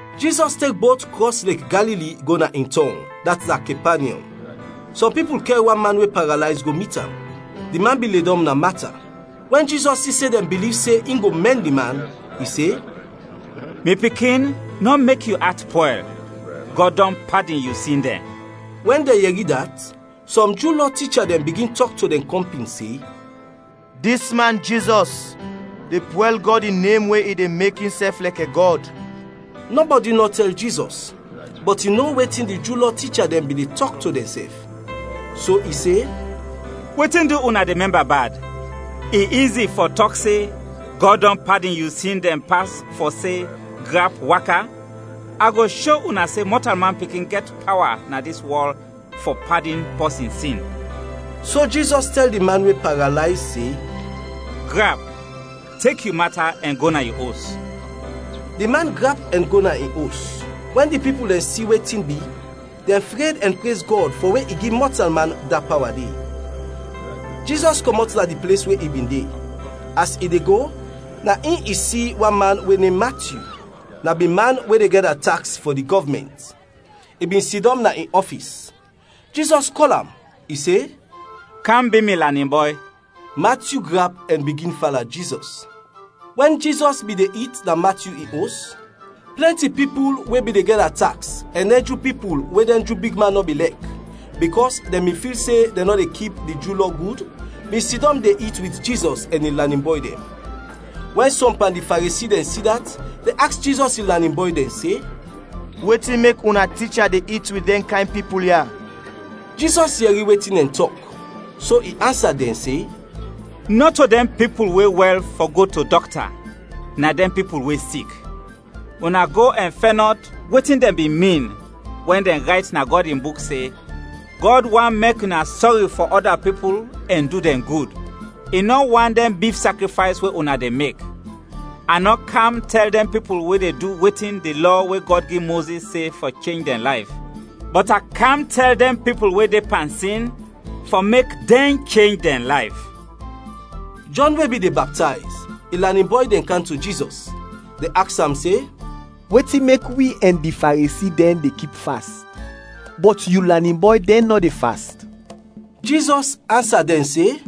Jizɔs tek bot krɔs Lek Galili go na in tɔng, dat na Kepanyɔm. Sɔm pipul kɛr wan man we paralayz go mit am, di man bin ledɔm na mata. Wɛn Jizɔs si se dɛn biliv se in go mɛn di man, i se, “Mi pikin, nɔ mek yu at pwɛl; Gɔd dɔn padin yu sin dɛn.” Wɛn dɛn yɛri dat sɔm Ju Lɔ ticha dɛn bigin tɔk to dɛn kɔmpin se, “Dis man, Jizɔs, de pwɛl Gɔd in nem we i de mek insɛf lɛkɛ Gɔd.” Nɔbɔdi nɔ tɛl Jizɔs, bɔt i no wetin di Ju Lɔ ticha dɛn bin de tɔk to dɛnsɛf, so i se, “Wetin du una de mɛmba bad? I izi fɔ tɔk se, ‘Gɔd dɔn padin yu sin dɛn’, pas fɔ se, ‘Grap, waka?’ A go sho una se Mɔtalman Pikin gɛt pawa na dis wɔl fɔ padin pɔsin sin.” So Jizɔs tɛl di man we paralayz se, “Grap, tek yu mata ɛn go na yu os.” Di man grap ɛn go na in os. Wɛn di pipul dɛn si wetin bi, dɛn fred ɛn prez Gɔd fɔ we i gi mɔtalman da pawa de. Jizɔs kɔmɔt na di ples we i bin de. As i de go, na in i si wan man we nem Matyu. Na bin man we de gɛda taks fɔ di gɔvmɛnt, i bin sidɔm na in ɔfis. Jizɔs kɔl am. I se, “Kam bi mi lanin bɔy.” Matyu grap ɛn bigin fala Jizɔs. Wɛn Jizɔs bin de it na Matyu in os, plɛnti pipul we bin de gɛda taks ɛn dɛn Ju pipul we dɛn Ju bigman nɔ bin lɛk, bikɔs dɛn bin fil se dɛn nɔ de kip di Ju Lɔ gud, bin sidɔm de it wit Jizɔs ɛn in lanin bɔy dɛn. Wɛn sɔm pan di Faresi dɛn si dat, dɛn aks Jizɔs in lanin bɔy dɛn se, “Wetin mek una ticha de it wit dɛn kayn pipul ya?” Jizɔs yɛri wetin dɛn tɔk, so i ansa dɛn se, “Nɔto dɛn pipul we wɛl fɔ go to dɔkta, na dɛn pipul we sik. Una go ɛn fɛnɔt wetin dɛn bin min wɛn dɛn rayt na Gɔd in Buk se, ‘Gɔd want mek una sɔri fɔ ɔda pipul ɛn du dɛn gud, i nɔ want dɛn bif sakrifays we una de mek!’ A nɔ kam tɛl dɛn pipul we de du wetin di Lɔ we Gɔd gi Mozis se fɔ chenj dɛn layf, bɔt a kam tɛl dɛn pipul we de pan sin fɔ mek dɛn chenj dɛn layf.” Jɔn we bin de baptayz, in lanin bɔy dɛn kam to Jizɔs, dɛn aks am se, “Wetin mek wi ɛn di Faresi dɛn de kip fast, bɔt yu lanin bɔy dɛn nɔ de fast?” Jizɔs ansa dɛn se,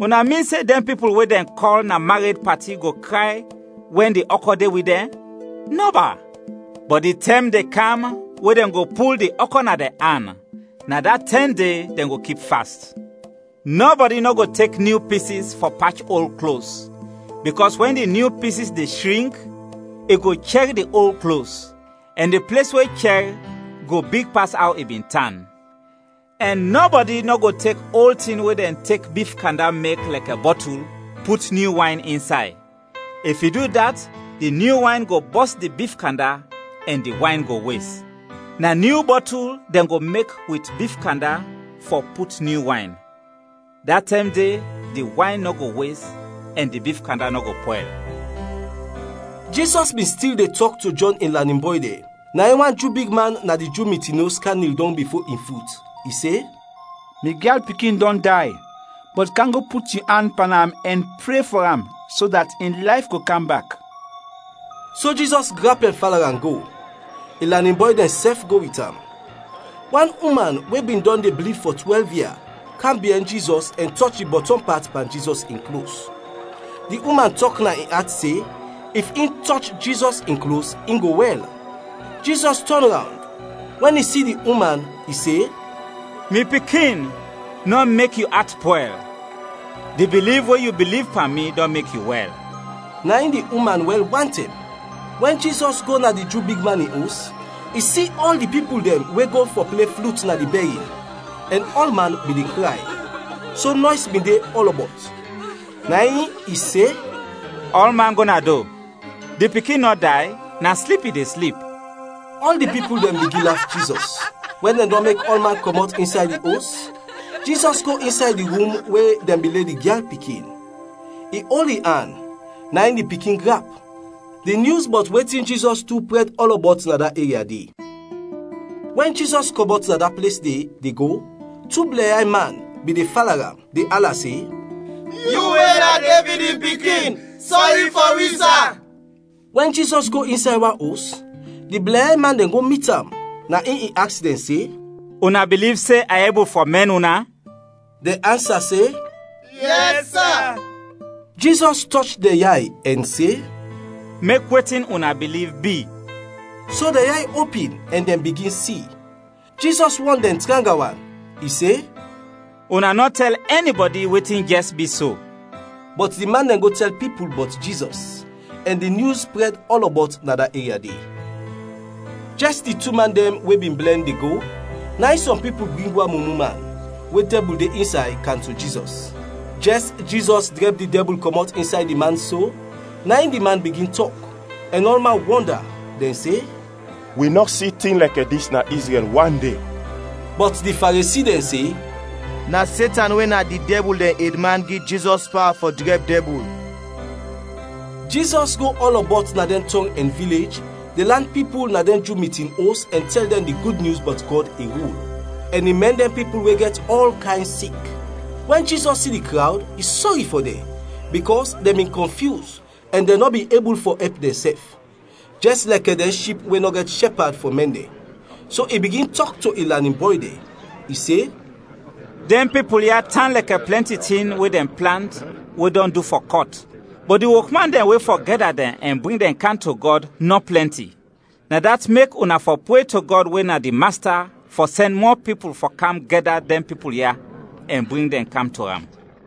“Una min se dɛn pipul we dɛn kɔl na mared pati go kray wɛn di ɔkɔ de wit dɛn? Nɔba! Bɔt di tɛm de kam we dɛn go pul di ɔkɔ na dɛn an, na da tɛm de dɛn go kip fast. “Nɔbɔdi nɔ go tek nyu pisis fɔ pach ol klos, bikɔs wɛn di nyu pisis de shrink, i go chɛr di ol klos, ɛn di ples we chɛr go big pas aw i bin tan. Ɛn nɔbɔdi nɔ go tek ol tin we dɛn tek bif kanda mek lɛkɛ bɔtul, put nyu wayn insay, if i du dat, di nyu wayn go bɔs di bif kanda ɛn di wayn go wes. Na nyu bɔtul dɛn go mek wit bif kanda fɔ put nyu wayn, da tɛm de di wayn nɔ go wes ɛn di bif kanda nɔ go pwɛl.” Jizɔs bin stil de tɔk to Jɔn in lanin bɔy dɛn, na in wan Ju bigman na di Ju mitin os kam nil dɔng bifo in fut, i se, “Mi gyal pikin dɔn day, bɔt kam go put yu an pan am ɛn pre fɔ am so dat in layf go kam bak.” So Jizɔs grap ɛn fala am go, in lanin bɔy dɛnsɛf go wit am. Wan uman we bin dɔn de blid fɔ twɛlv ia, kam biɛn Jizɔs ɛn tɔch di bɔtɔm pat pan Jizɔs in klos. Di uman tɔk na in at se, if in tɔch Jizɔs in klos, in go wɛl. Jizɔs tɔn rawnd; wɛn i si di uman, i se, “Mi pikin, nɔ mek yu at pwɛl! Di biliv we yu biliv pan mi dɔn mek yu wɛl.” Na in di uman wɛl wantɛm. Wɛn Jizɔs go na di Ju bigman in os, i si ɔl di pipul dɛn we go fɔ ple flut na di bɛrin ɛn ɔlman bin de kray, so nɔys bin de ɔlɔbɔt. Na in i se, “Ɔlman go na do. Di pikin nɔ day, na slip i de slip.” Ɔl di pipul dɛn bigin laf Jizɔs. Wɛn dɛn dɔn mek ɔlman kɔmɔt insay di os, Jizɔs go insay di rum we dɛn bin le di gyal pikin, i ol in an, na in di pikin grap. Di nyus bɔt wetin Jizɔs du prɛd ɔlɔbɔt na da eria de. Wɛn Jizɔs kɔmɔt na da ples de, de go, tu blɛnyay man bin de fala am, de ala se, “Yu we na Devid in pikin, sɔri fɔ wi, sa!” Wɛn Jizɔs go insay wan os, di blɛnyay man dɛn go mit am, na in i aks dɛn se, “Una biliv se a ebul fɔ mɛn una?” Dɛn ansa se, “Yɛs, sa.” Jizɔs tɔch dɛn yay ɛn se, “Mek wetin una biliv bi!” So dɛn yay opin ɛn dɛn bigin si. Jizɔs wɔn dɛn tranga wan. I se, “Una nɔ tɛl ɛnibɔdi wetin jɛs bi so.” Bɔt di man dɛn go tɛl pipul bɔt Jizɔs, ɛn di nyus prɛd ɔlɔbɔt na da eria de. Jɛs di tu man dɛn we bin blɛn, de go, na in sɔm pipul bring wan mumu man, we dɛbul de insay, kam to Jizɔs. Jɛs Jizɔs drɛb di dɛbul kɔmɔt insay di man so, na in di man bigin tɔk, ɛn ɔlman wɔnda, dɛn se, “Wi nɔ si tin lɛkɛ dis na Izrɛl wande!” Bɔt di Faresi dɛn se, “Na Setan we na di dɛbul dɛn edman gi Jizɔs pawa fɔ drɛb dɛbul.” Jizɔs go ɔlɔbɔt na dɛn tɔng ɛn vilej, de lan pipul na dɛn Ju mitin os ɛn tɛl dɛn di Gud Nyus bɔt Gɔd in rul, ɛn i mɛn dɛn pipul we gɛt ɔl kayn sik. Wɛn Jizɔs si di krawd, i sɔri fɔ dɛn, bikɔs dɛn bin kɔnfyus ɛn dɛn nɔ bin ebul fɔ ɛp dɛnsɛf, jɛs lɛkɛ dɛn ship we nɔ gɛt shɛpad fɔ mɛn dɛn. So i bigin tɔk to in lanin bɔy dɛn. I se, “Dɛn pipul ya tan lɛkɛ plɛnti tin we dɛn plant we dɔn du fɔ kɔt, bɔt di wokman dɛn we fɔ gɛda dɛn ɛn bring dɛn kam to Gɔd, nɔ plɛnti. Na dat mek una fɔ pre to Gɔd we na di Masta fɔ sɛn mɔ pipul fɔ kam gɛda dɛn pipul ya ɛn bring dɛn kam to am.”